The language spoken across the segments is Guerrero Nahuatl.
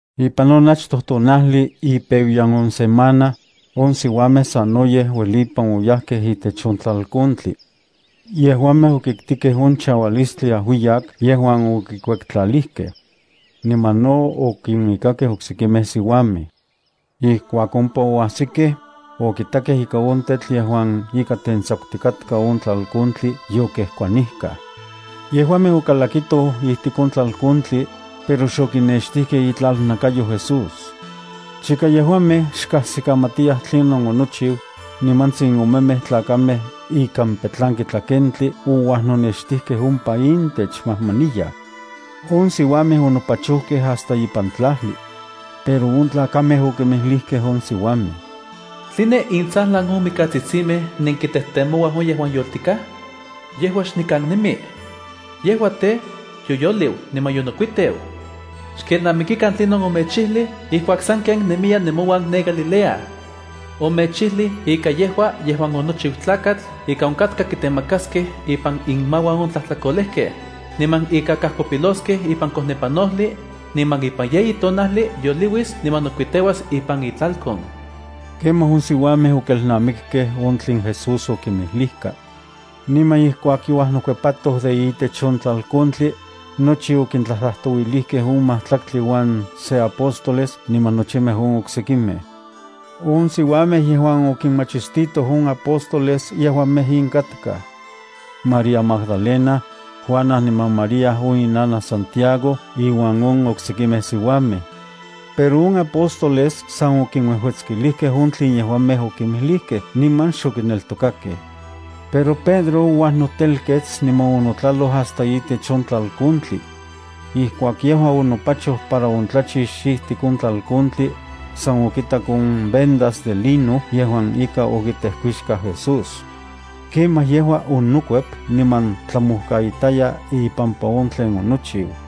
Ipan on achtoj tonajli ipeuyan on semana, on siuamej sanoyej uelipan oyajkej itech on tlalkontli. Yejuamej okiktikej on chaualistli ajuiyak yejuan okikuektlalijkej. Niman no okinuikakej oksekimej siuamej. Ijkuak ompa oajsikej, okitakej ika on tetl yejuan ika tentsakutikatka on tlalkontli yokejkuanijkaj. Yejuamej okalakitoj ijtik on tlalkontli, pero xokinextijkej itlalnakayo Jesús. Chika yejuamej xkajsikamatiyaj tlinon onochiu, nimantsin omemej tlakamej ikan petlanki tlakentli ouajnonextijkej ompa intech majmaniyaj. On siuamej onopachojkej hasta ipan tlajli. Pero on tlakamej okinmijlijkej on siuamej: —¿Tline intsajlan on mikatsitsimej nenkitejtemouaj on yejuan yoltikaj? Yejua xnikan nemi. Yejua tej, yoyoliu niman yonokuiteu. Xkelnamikikan tlinon omechijlij ijkuak sanken nemiya nemouan ne Galilea. Omechijlij ika yejua yejuan onochiu Tlakatl ika onkatka kitemakaskej ipan inmauan on tlajtlakolejkej, niman ika kajkopiloskej ipan kojnepanojli, niman ipan yeyi tonajli yoliuis niman nokuiteuas ipan itlalkon. Kemaj on siuamej okelnamikkej on tlen Jesús okinmijlijka. Niman ijkuak youajnokuepatoj de itech on tlalkontli, nochi okintlajtlajtouilijkej on majtlaktli uan se apóstoles niman nochimej on oksekimej. On siuamej yejuan okinmachistitoj on apóstoles yejuamej in katkaj: María Magdalena, Juana niman María on inanaj Santiago inuan on oksekimej siuamej. Pero on apóstoles san okinuejuetskilijkej ika on tlen yejuamej okinmijlijkej niman xokineltokakej. Pero Pedro ouajnotelkets niman onotlaloj hasta itech on tlalkontli. Ijkuak yejua onopachoj para ontlachix ijtik on tlalkontli, san okitak on vendas de lino yejuan ika okitejkuixkaj Jesús. Kemaj yejua onokuep niman tlamojkaitaya ipampa on tlen onochiu.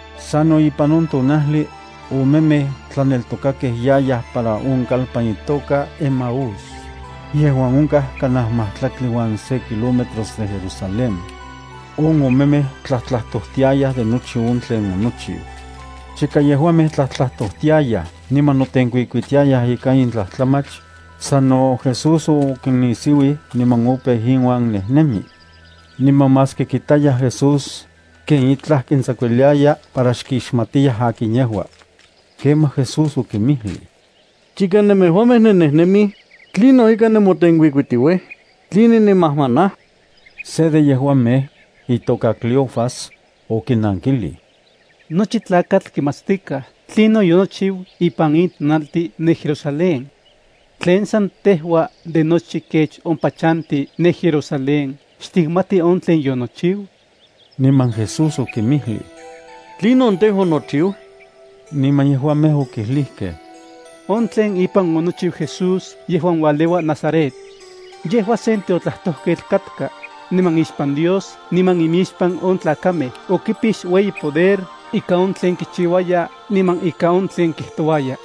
Sano ipan on tonajli, omemej tlaneltokakej yayaj para on kalpan itoka Emaús, yejuan onkaj kanaj majtlaktli uan se kilómetros de Jerusalén. On omemej tlajtlajtojtiayaj de nochi on tlen onochiu. Chika yejuamej tlajtlajtojtiayaj niman notenkuikuitiayaj ika in tlajtlamach, sano Jesús okinnisiuij niman opeu inuan nejnemi. Niman maski kitayaj Jesús, ken itlaj kintsakuiliaya para xkixmatiyaj akin yejua. Kemaj Jesús okinmijlij: —Chika nemejuamej nennejnemij, ¿tlinon ika nemotenkuikuitiuij? ¿Tline nemajmanaj? Se de yejuamej, itoka Cleofas, okinankilij: —Nochi tlakatl kimatstikaj tlinon yonochiu ipan in tonaltin ne Jerusalén. ¿Tlen san tejua de nochi kech ompa chantij ne Jerusalén xtikmati on tlen yonochiu? Niman Jesús okinmijlij: —¿Tlinon tej, onochiu? Niman yejuamej okijlijkej: —On tlen ipan onochiu Jesús yejuan ualeua Nazaret. Yejua sen tiotlajtojketl katka niman ixpan Dios niman imixpan on tlakamej okipix ueyi poder ika on tlen kichiuaya niman ika on tlen kijtouaya.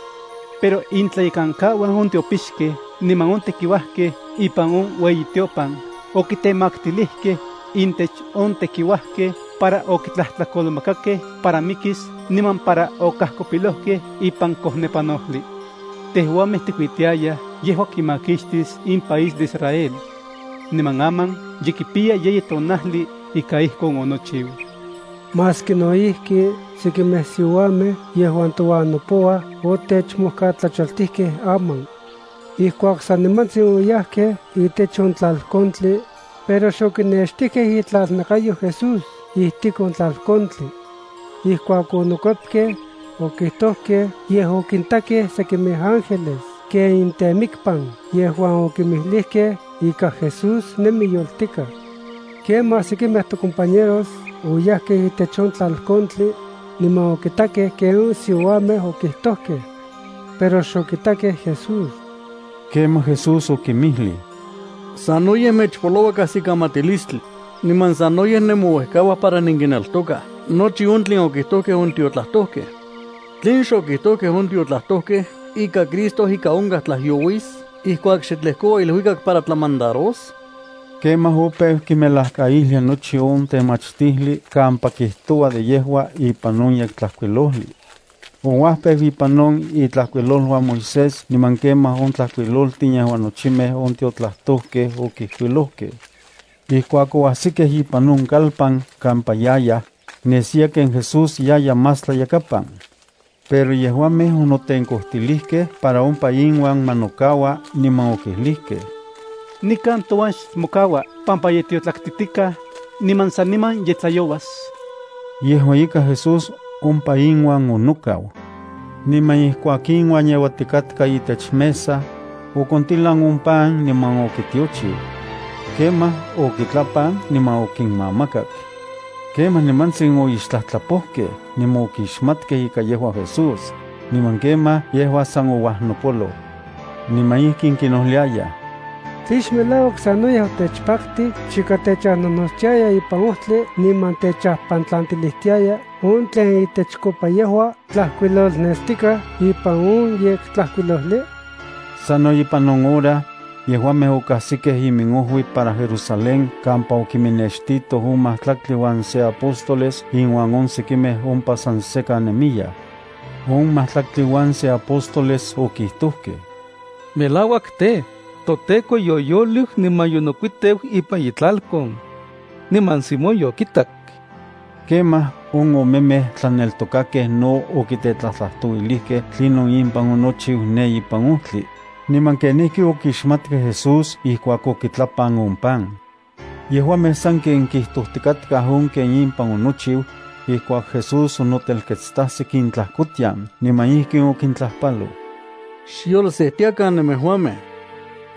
Pero intlayekankauan on tiopixkej niman on tekiuajkej ipan on ueyitiopan okitemaktilijkej intech on tekiuajkej para okitlajtlakolmakakej para mikis niman para okajkopilojkej ipan kojnepanojli. Tejuamej tikuitiayaj yejua kimakixtis in país de Israel. Niman aman ye kipiya yeyi tonajli ika ijkon onochiu. Maski no ijki sekimej siuamej yejuan touan nopouaj otechmojkatlachaltijkej aman. Ijkuak sanimantsin, oyajkej itech on tlalkontli, pero xokinextijkej itlalnakayo Jesús ijtik on tlalkontli. Ijkuak onokuepkej, okijtojkej yej okintakej sekimej ángeles ken intemikpan yejuan okinmijlijkej ika Jesús nemi yoltikaj. Kemaj sekimej tocompañeros oyajkej itech on tlalkontli, niman okitakej ken on siuamej okijtojkej. Pero xokitakej Jesús. Kemaj Jesús okinmijlij: —¡Sanoyej mechpoloua kajsikamatilistli, niman sanoyej nemouejkauaj para nenkineltokaj nochi on tlen okijtojkej on tiotlajtojkej! ¿Tlen xokijtojkej on tiotlajtojkej ika Cristo ika onkaj tlajyouis ijkuak xe tlejkoua iluikak para tlamandaros? Kemaj opeu kinmelajkaijlia nochi on temachtijli kampa kijtoua de yejua ipan on Yektlajkuilojli. Ouajpeu ipan on itlajkuiloluan Moisés niman kemaj on tlajkuiloltin yejuan nochimej on tiotlajtojkej okijkuilojkej. Ijkuak oajsikej ipan on kalpan kampa yayaj, nesiya ken Jesús yaya más tlayakapan. Pero yejuamej onotenkojtilijkej para ompa inuan ma nokaua niman okijlijkej: —Nikan touan xmokaua, pampa ye tiotlaktitikaj, niman saniman ye tlayouas. Yejua ika, Jesús ompa inuan onokau. Niman ijkuak inuan yeuatikatka itech mesa, okontilan on pan, niman okitiochiu. Kemaj okitlapan niman okinmamakak. Kemaj nimantsin oixtlajtlapojkej niman okixmatkej ika yejua Jesús, niman kemaj yejua san ouajnopoloj. Niman ijkin kinojliayaj: —¿Tlen xmelauak sanoyej otechpaktij chika techajnojnotstiaya ipan ojtli niman techajpantlantilijtiaya on tlen itechkopa yejua tlajkuilolnestikaj ipan on Yektlajkuilojli? Sano ipan on hora, yejuamej okajsikej iminojui para Jerusalén kampa okiminnextitoj on majtlaktli uan se apóstoles inuan on sekimej ompa san sekan nemiyaj. On majtlaktli uan se apóstoles okijtojkej: —Melauak tej, toTEKO yoyoliu niman yonokuiteu ipan itlalkon. Niman Simón yokitak. Kemaj on omemej tlaneltokakej no okitetlajtlajtouilijkej tlinon impan onochiu ne ipan ojtli, niman kenijki okixmatkej Jesús ijkuak okitlapan on pan. Yejuamej sanken kijtojtikatkaj on ken impan onochiu, ijkuak Jesús onotelketstajsik intlajkotian niman ijkin okintlajpaloj: —Xyolsejtiakan nemejuamej.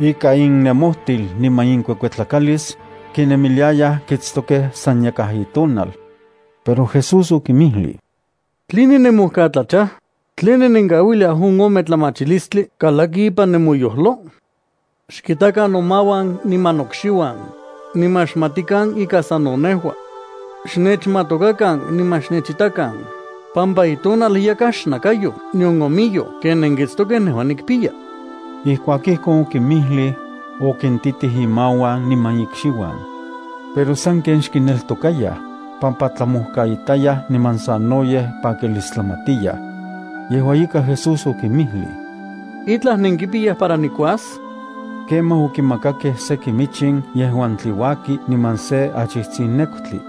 Ikan innemojtil niman inkuekuetlakalis, kinemiliayaj kitstokej san yakaj itonal. Pero Jesús okinmijlij: —¿Tline nemojkatlachaj? ¿Tline nenkauiliaj on ometlamatilistli kalaki ipan nemoyojlo? Xkitakan nomauan niman nokxiuan, niman xmatikan ika sano nejua. Xnechmatokakan niman xnechitakan pampa itonal yakaj xnakayoj nion omiyoj ken nenkitstokej nejua nikpiya. Ijkuak ijkon okinmijlij, okintitij imauan niman ikxiuan. Pero sanken xkineltokayaj, pampa tlamojkaitayaj niman sanoyej pakilistlamatiyaj. Yejua ika Jesús okinmijlij: —¿Itlaj nenkipiyaj para nikuas? Kemaj okimakakej seki michin yejuan tliuaki niman se achijtsin nekutli.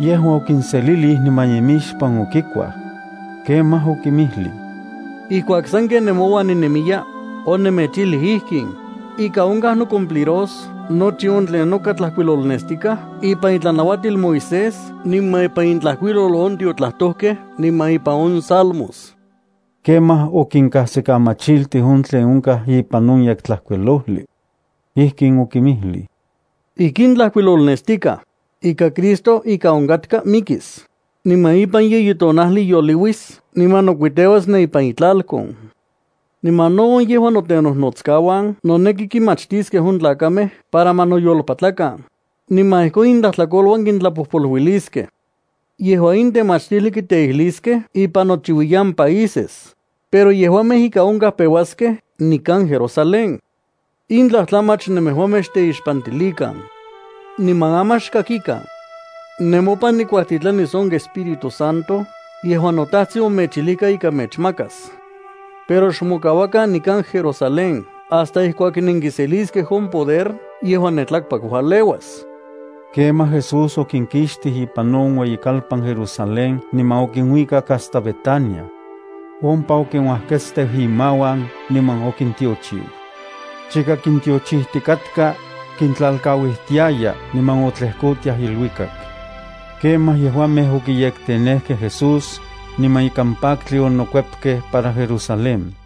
Yejua okinselilij niman imixpan okikuaj. Kemaj okinmijlij: —Ijkuak sanken nemouan ninemiya, onemechijlij ijkin: Ika onkaj nocumpliros nochi on tlen noka tlajkuilolnestikaj ipan itlanauatil Moisés niman ipan intlajkuilol on tiotlajtojkej niman ipan on salmos. Kemaj okinkajsikamachiltij on tlen onkaj ipan on Yektlajkuilojli. Ijkin okinmijlij: —Ijkin tlajkuilolnestikaj, ika Cristo ika onkatka mikis, niman ipan yeyi tonajli yoliuis niman nokuiteuas ne ipan itlalkon. Niman no on yejuan notenojnotskauan noneki kinmachtiskej on tlakamej para ma noyolpatlakan, niman ijkon intlajtlakoluan kintlapojpoluiliskej. Yejua in temachtijli kiteijliskej ipan nochiuiyan países, pero yejuamej ika onkaj peuaskej nikan Jerusalén. In tlajtlamach nemejuamej xteixpantilikan. Niman aman xkakikan. Nemopan nikuajtitlanis on Espíritu Santo yejuan noTajtsin omechijlijka ika mechmakas. Pero xmokauakan nikan Jerusalén hasta ijkuak nenkiseliskej on poder yejuan ne tlakpak ualeuas. Kemaj Jesús okinkixtij ipan on ueyikalpan Jerusalén niman okinuikak hasta Betania. Ompa okinuajketsteu imauan niman okintiochiu. Chika kintiochijtikatka, kintlalkauijtiaya niman otlejkotiaj iluikak. Kemaj yejuamej okiyektenejkej Jesús, niman ikan paktli onokuepkej para Jerusalén.